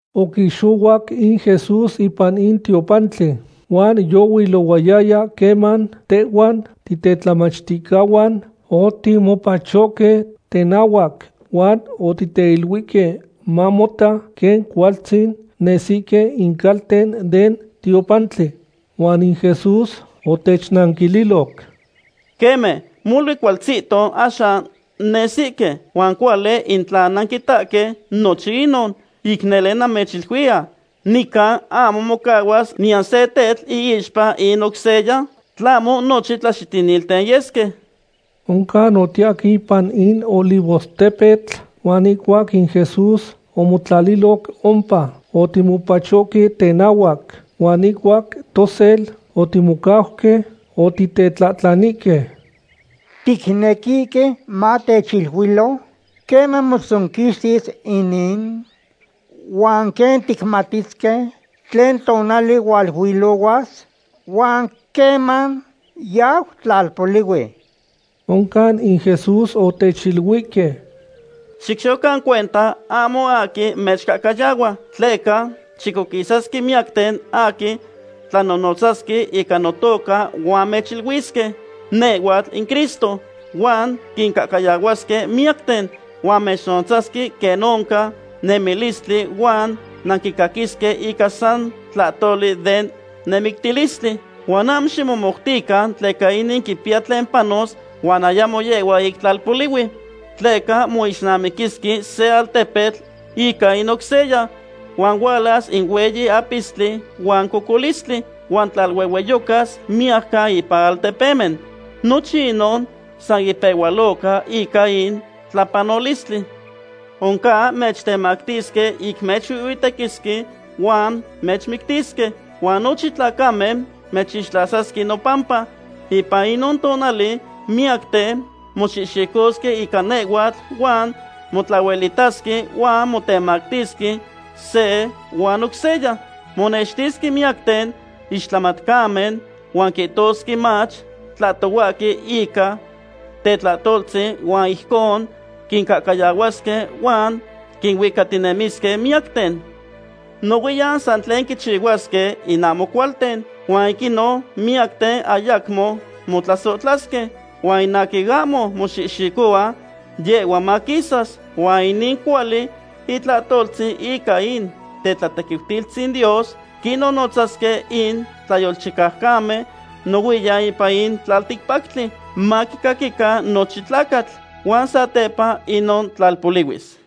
Oquixohuac in Jesús ipan in tiopantli, huan yohuilohuayaya queman tehhuan titetlamachticahuan otimopachOhque tenahuac huan oticteiluihque mamota quen cualtzin nesihque in calten den tiopantli. Huan in Jesús otechnanquililoc: ―Queme, molui cualtzihto axan nesihque, huan cuali in tla nanquitahque nochin inon. Ic nele namechiluiya, nican ahmo mocahuas niyan se tetl iixpa in oc seya, tlahmo nochin tlaxitinilten yesque. Oncan otiyahque ipan in Olivostepetl, huan ihcuac in Jesús omotlaliloc ompa, otimopachohque tenahuac, huan ihcuac tosel otimocauque, otitetlahtlanihque: ―Ticnequihque matechiluilo queman motzonquixtis inin, huan quen ticmatisque tlen tonali hualuilohuas, huan queman yau tlalpolihui. Oncan in Jesús otechiluihque: ―Xicchihuacan cuenta ahmo aquin mechcahcayahua. Tleca chicoquisasque miyacten aquin tlanonotzasque ica notoca huan mechiluisque: “Nehhuatl in Cristo”, huan quincahcayahuasque miyacten. Huan mechnonotzasque quen oncan nemictilistli huan nanquicaquisque ica san tlahtoli den nemictilistli. Huan ahmo ximomoutican tleca inin quipiya tlen panos huan ayamo yehhua ic tlalpolihui. Tleca moixnamiquisque se altepetl ica in oc seya, huan hualas in hueyi apistli huan cocolistli, huan tlaluehueyocas miyajcan ipan altepemen. Nochin inon san ipehualoca ica in tlapanolistli. ’Oncan mechtemactisque ic mechuihhuitequisque huan mechmictisque, huan nochin tlacamen mechixtlasasque nopampa. Ipan inon tonali miyacten moxihxicosque ica nehhuatl huan motlahuelitasque huan motemactisque se huan oc seya. Monextisque miyacten ixtlamatcamen, huan quihtosque mach tlahtohuahque ica tetlahtoltzin huan ijcon quincahcayahuasque huan quinuicatinemisque miyacten. Nohuiyan san tlen quichihuasque in ahmo cualten, huan ic inon miyacten ayacmo motlasohtlasque. Huan in aquin ahmo moxihxicohua, yehhua maquisas. Huan inin cuali itlahtoltzin ica in tetlatequiutilistzin Dios quinonotzasque in tlayolchicaucamen nohuiyan ipan in tlalticpactli, maquicaquican nochin tlacatl. Huan satepa inon tlalpolihuis.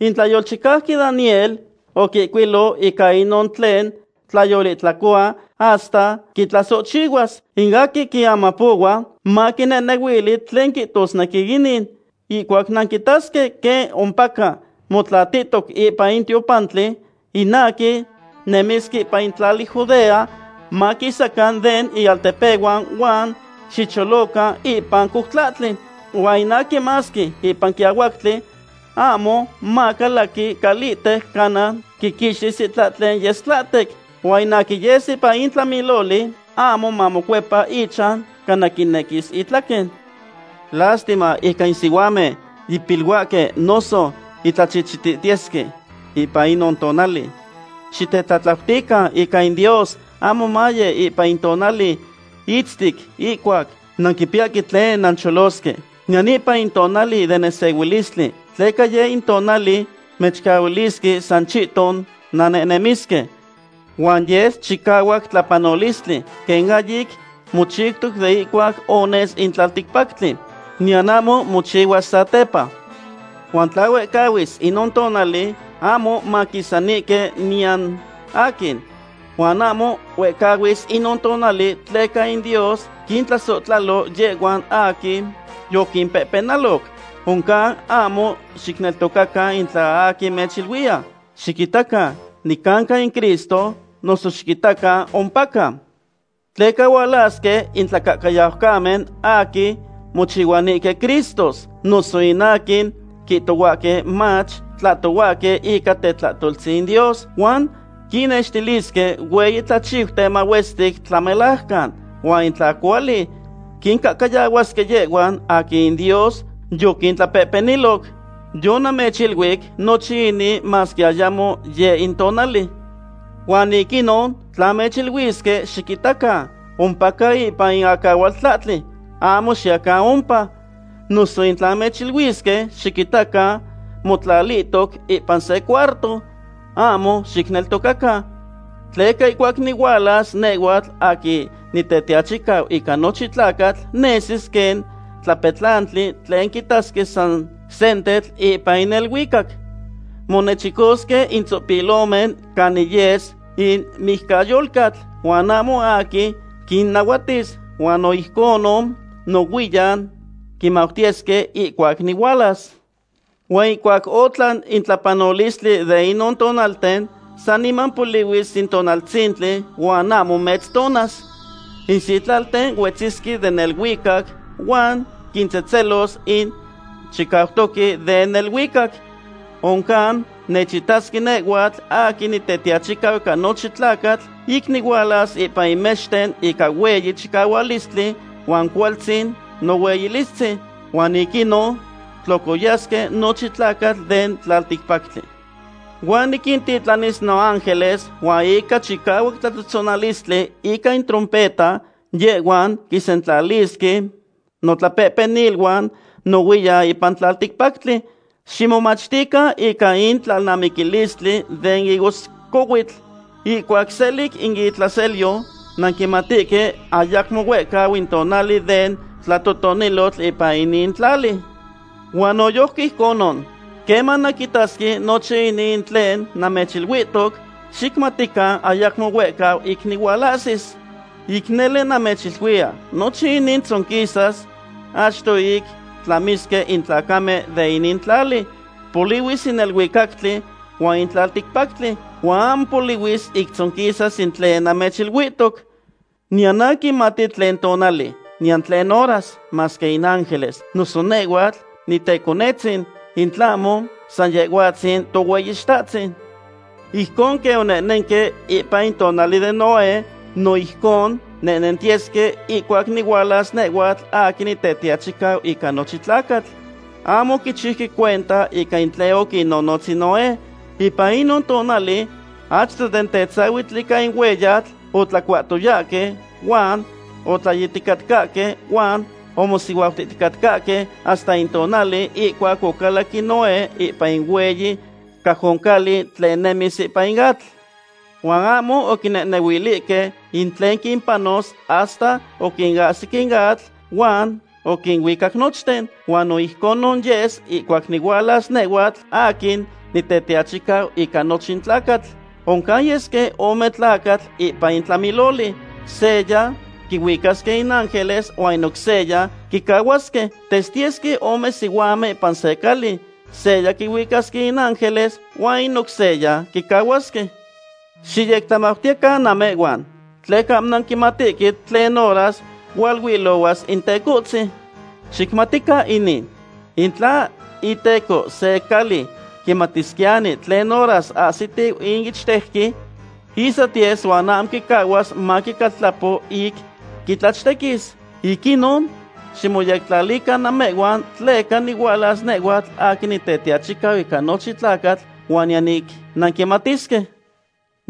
’In tlayolchicauqui Daniel oquihcuilo ica inon tlen tlayolihtlacohua hasta quitlasohchihuas. In aquin quiamapohua, maquinehnehuilui tlen quihtosnequi inin. Ihcuac nanquitasque quen ompaca motlalihtoc ipan in tiopantli, in aquin nemisque ipan tlali Judea, maquisacan den inaltepehuan huan xicholocan ipan coutlahtli. Huan in aquin masque ipan quiahuactli, ahmo macalaqui calihtec cana quiquixtis itlahtlen yes tlahtec. Huan in aquin yes ipan in tlamiloli, ahmo mamocuepa ichan cana quinequis itlaquen. ¡Lastima ica in sihuamen yipiluahque noso yitlachihchitihtiyesque ipan inon tonali! Xitetlatlautican in Dios ahmo maye ipan in tonali itztic ihcuac nanquipiyahque tlen nancholosque, niyan ipan in tonali den nesehuilistli, tleca yeh in tonali mechcahuilisque san chihton nannehnemisque. Huan yes chicahuac tlapanolistli, quen ahyic mochiutoc de ihcuac ones in tlalticpactli, niyan ahmo mochihuas satepa. Huan tla huehcahuis inon tonali, ahmo maquisanihque niyan aquin. Huan ahmo huehcahuis inon tonali tleca in Dios quintlasohtlalo yehhuan aquin yoquimpehpenaloc. ’Oncan ahmo xicneltocacan in tla aquin mechiluiya: “Xiquitacan, nicanca in Cristo”, noso “Xiquitacan, ompaca.” Tleca hualasque in tlacahcayaucamen aquin mochihuanihque Cristos noso in aquin quihtohuahque mach, tlahtohuahque ica tetlahtoltzin in Dios. Huan quinnextilisque hueyi tlachiuten mahuestic tlamelajcan, huan in tla cuali quincahcayahuasque yehhuan aquin in Dios yoquintlapehpeniloc. Yonamechiluic nochin inin masque ayamo yeh in tonali. Huan ic inon, tla mechiluisque: “Xiquitacan, ompaca ipan in acahualtlahtli”, ahmo xiyacan ompa. Noso in tla mechiluisque: “Xiquitacan, motlatihtoc ipan se cuarto”, ahmo xicneltocacan. Tleca ihcuac nihualas nehhuatl aquin Nitetiachicau ica nochin tlacatl, nesis quen tlapetlani tlen quitasque san sentetl ipan in neluicac. Monechicosque in tzopilomen canin yes in mijcayolcatl, huan ahmo aquin quinnahuatis. Huan no ijcon nohuiyan quimautiyesque ihcuac nihualas. ’Huan ihcuac otlan in tlapanolistli de inon tonalten, saniman polihuis in tonaltzintli huan ahmo metztonas. In sitlalten huetzisque den neluicac huan quintzehtzelos in chicautoque den neluicac. Oncan nechitasque nehhuatl aquin Nitetiachicau ica nochin tlacatl ic nihualas ipan in mexten ica hueyi chicahuilistli huan cualtzin nohueyilistzin. Huan ic inon tlocoyasque nochin tlacatl den tlalticpactli. Huan niquintitlanis noángeles huan ica chicahuac tlatzohtzonalistli ica in trompeta yehhuan quinsentlalisque notlapehpeniluan nohuiyan ipan tlalticpactli. ’Ximomachtican ica in tlalnamictilistli den higoscohuitl. Ihcuac selic in itlaselyo, nanquimatihque ayacmo huehcau in tonali den tlatotonilotl ipan inin tlali. Huan noyojqui ijconon, queman nanquitasque nochin inin in tlen namechiluihtoc, xicmatican ayacmo huehcau ic nihualahsis. Ic nele namechiluiya, nochin inin tzonquisas achto ic tlamisque in tlacamen de inin tlali. Polihuis in neluicac huan in tlalticpactli, huan ahmo polihuis ic tzonquisas in tlen namechiluihtoc. ’Niyan aquin quimati tlen tonali, niyan tlen horas, masque in ángeles, noso nehhuatl niteconetzin, in tlahmo san Yehhuatzin Tohueyitahtzin. ’Ijcon quen onehnenque ipan in tonali den Noé, no ijcon nentiyesque ihcuac nihualas nehhuatl aquin Nitetiachicau ica nochin tlacatl. Ahmo oquichiuque cuenta ica in tlen oquinnonotz in Noé. Ipan inon tonali, achto den tetzahuitl ica in hueyatl, otlacuahticatcahque huan otlayihticatcahque huan omosihuautihticatcahque hasta in tonali ihcuac ocalac in Noé ipan in hueyi cajoncali tlen nemis ipan atl. Huan ahmo oquinehnehuilihque in tlen quimpanos hasta oquinahsi in atl huan oquinuicac nochten. Huan no ijcon yes ihcuac nihualas nehhuatl aquin Nitetiachicau ica nochin tlacatl. Oncan yesque ome tlacatl ipan in tlamiloli. Seya quihuicasque in ángeles huan in oc seya quicahuasque. Testiyesque ome sihuamen ipan se cali. Seya quihuicasque in ángeles huan in oc seya quicahuasque. ’Xiyectlamautiyecan namehhuan, tleca ahmo nanquimatihque tlen horas hualuilohuas in Tecohtzin. Xicmatican inin. In tla iteco se cali quimatisquiyani tlen horas ahsitiu in ichtejqui, ihsatiyes huan ahmo mocahuas maquicaltlapo ic quitlachtequis. Ic inon, ximoyectlalican namehhuan tleca nihualas nehhuatl aquin Nitetiachicau ica nochin tlacatl huan niyan ic nanquimatisque.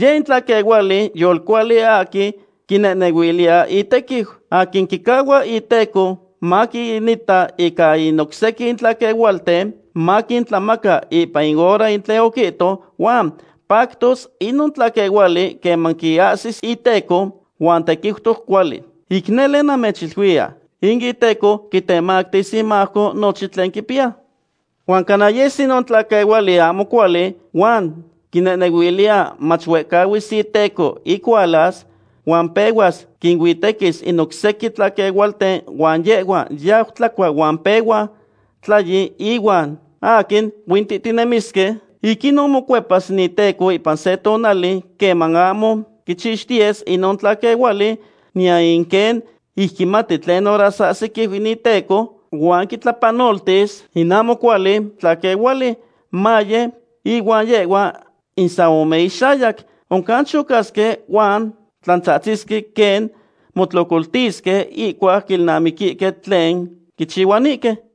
’Yeh in tlaquehuali yolcuali aquin quinehnehuiliya itequiu, aquin quicahua iteco maquinita ica in oc sequin tlaquehualten, maquintlamaca ipan in hora in tlen oquihto. Huan pactoc inon tlaquehuali queman quiahsis iteco huan tequiutoc cuali. Ic nele namechiluiya, in iteco quitemactis imajco nochin tlen quipiya. Huan cana yes inon tlaquehuali ahmo cuali, huan quinehnehuiliya mach huehcahuis iteco ic hualas, huan pehuas quinuitequis in oc sequin tlaquehualten huan yehhua yau tlacua huan pehua tlayi ihuan aquin huintitinemisque. Ic inon mocuepas in iteco ipan se tonali queman ahmo quichixtiyes inon tlaquehuali, niyan quen ic quimati tlen horas ahsiquiu in iteco. Huan quitlapanoltis in ahmo cuali tlaquehuali, maye inuan yehhuan in san ome inxayac. Oncan chocasque huan tlantzahtzisque quen motlocoltisque ihcuac quilnamiquihque tlen quichihuanihque.